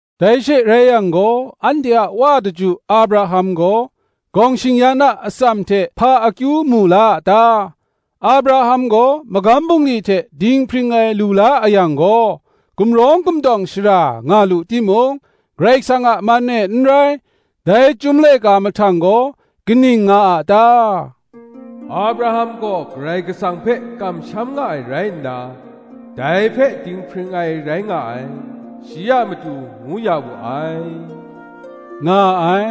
Dai she rai yang gaw, anhte a wa daju Abraham gaw, gawng shing-yan a atsam hte hpa akyu mu la a ta? Abraham gaw magam bungli hte dinghpring ai lu la a yang gaw, gumrawng gumtawng shara nga lu timung, Karai Kasang a man e n rai. Dai Chyum Laika mahtang gaw kaning nga a ta? Abraham gaw Karai Kasang hpe kamsham nga ai rai nna, dai hpe dinghpring ai rai nga ai, shi a matu ngu ya wu ai, nga ai.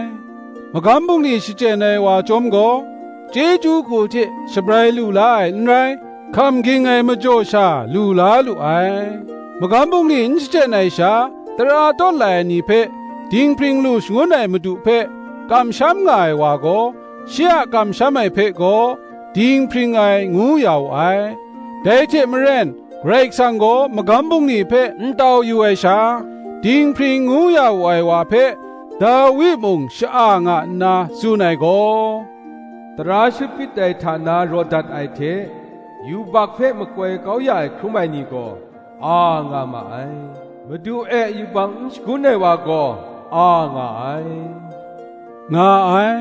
Magam bungli shachyen ai wa chyawm gaw, chyeju hku hte shabrai lu la ai n rai, hkam ging ai majaw sha lu la lu ai. Magam bungli n shachyen ai sha, tara tawt lai ai ni hpe dinghpring lu shangun ai madu hpe kamsham nga ai wa gaw, shi a kamsham ai hpe gaw, dinghpring ai, ngu ya wu ai. Dai hte maren, Karai Kasang gaw magam bungli hpe n tau yu ai sha, dinghpring ngu ya wu ai wa hpe, Dawi mung sha-a nga nna tsun ai gaw: “Tara shut hpyit ai hta na raw dat ai hte, Yubak hpe makoi kau ya ai hkrum ai ni gaw, a nga ma ai; Madu e yubak n shagun ai wa gaw a nga ai,” nga ai.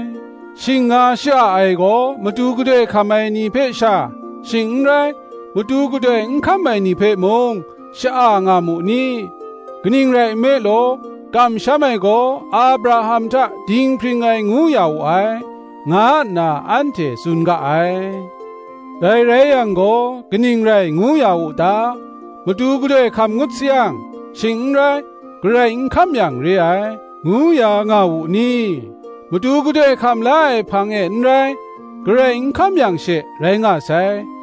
Shing nga sha-a ai gaw, matu gadoi hkam ai ni hpe sha, shing n rai, matu gadoi n hkam ai ni hpe mung, sha-a nga mu ni? Kaning rai nme law, kamsham ai gaw Abraham hta dinghpring ai ngu ya wu ai, nga nna anhte tsun ga ai. Dai rai yang gaw, kaning rai ngu ya wu ta? Matu gadoi hkam ngut sayang, shing n rai, garai n hkam yang re ai, ngu ya nga wu ni? Matu gadoi hkam la ai hpang e n rai, garai n hkam yang she, rai nga sai.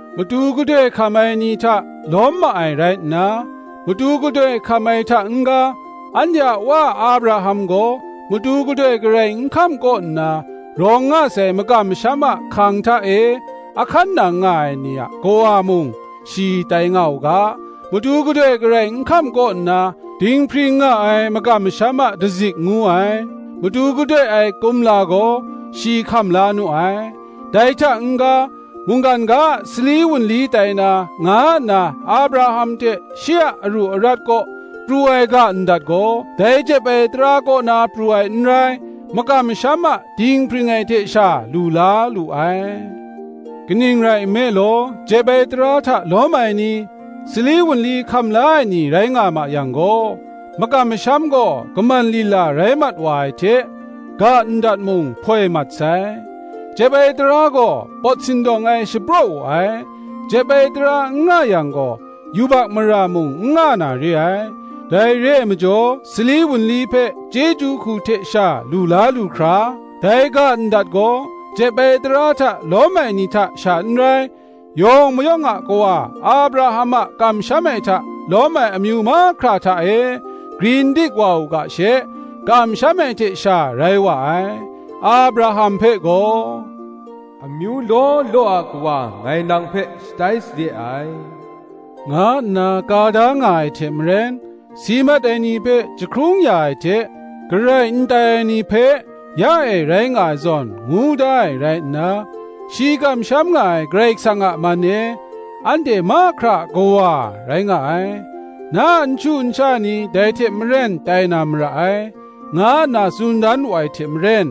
matu gadoi hkam ai ni hta lawm ma ai rai nna, matu gadoi hkam ai hta n-ga, anhte a wa Abraham gaw matu gadoi garai n hkam kaw nna rawng nga sai makam masham a hkang hta e a hkan nang nga ai ni a kawa mung shi tai nga u ga, matu gadoi garai n hkam kaw nna, dinghpring nga ai makam masham a dazik ngu ai, matu gadoi ai kumla gaw, shi hkam la nu ai. Dai hta n-ga, mungkan ga a sali wunli tai na, nga nna Abraham hte shi a aru arat kaw pru ai ga ndat gaw, dai jep ai tara kaw na pru ai n rai, makam masham a dinghpring ai hte sha lu la lu ai. Kaning rai nme law, jep ai tara hta lawm ai ni, sali wunli hkam la ai ni rai nga ma yang gaw, makam masham gaw kaman lila rai mat wa ai hte, ga ndat mung hpoi mat sai. Jep ai tara gaw pawt sindawng ai shapraw wu ai; jep ai tara n nga yang gaw, yubak mara mung n nga na re ai. Dai re ai majaw, sali wunli hpe chyeju hku hte sha lu la lu hkra, dai ga ndat gaw jep ai tara hta lawm ai ni hta sha n rai, yawng mayawng a kawa Abraham a kamsham ai hta lawm ai amyu mahkra hta e grin dik wa u ga she, kamsham ai hte sha rai wa ai: Abraham hpe gaw, Amyu law law a kawa ngai nang hpe shatai sade ai, nga nna ka da nga ai hte maren si mat ai ni hpe jahkrung ya ai hte, garai n tai ai ni hpe ya e rai nga ai zawn ngu da ai rai nna, shi kamsham nga ai Karai Kasang a man e, anhte mahkra a kawa rai nga ai. Na a nshu nsha ni dai hte maren tai na mara ai, nga nna tsun dan wu ai hte maren,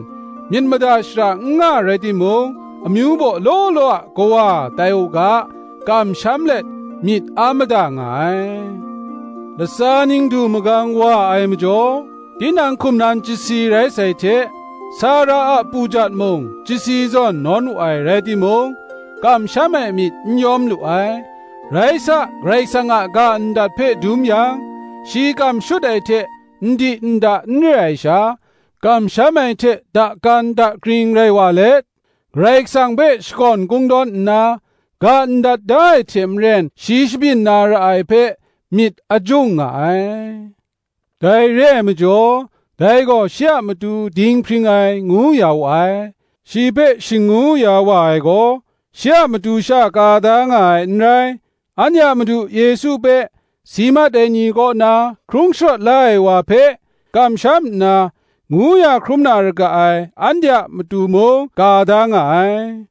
myit mada shara n nga rai timung, amyu baw law law a kawa tai u ga, kamsham let, myit a mada nga ai. Latsa ning du magang wa ai majaw, tinang hkum nan chyasi rai sai hte, Sara a pujat mung chyasi zawn nawn wu ai rai timung, kamsham ai myit n yawm lu ai: rai sa, Karai kasang a ga ndat hpe dum yang, shi kam shut ai hte ndi nda n re ai sha, kamsham ai hte dakan dakring rai wa let, Karai Kasang hpe shakawn kungdawn nna, ga ndat da ai hte maren shi shabyin na ra ai hpe, myit a jung nga ai. Dai re ai majaw, dai gaw shi a matu dinghpring ai, ngu ya wu ai. Shi hpe shing ngu ya ai wa gaw, shi a matu sha ka da nga ai n rai: anhte a Madu Yesu hpe si mat ai ni kaw na hkrung sharawt la ai wa hpe kamsham nna, ngu ya hkrum na ra ga ai, anhte a matu mung ka da nga ai: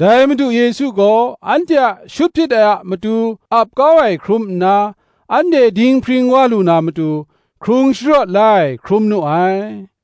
dai Madu Yesu gaw, anhte a shut hpyit ai a matu ap kau ai hkrum nna, anhte dinghpring wa lu na matu, hkrung sharawt la ai hkrum nu ai.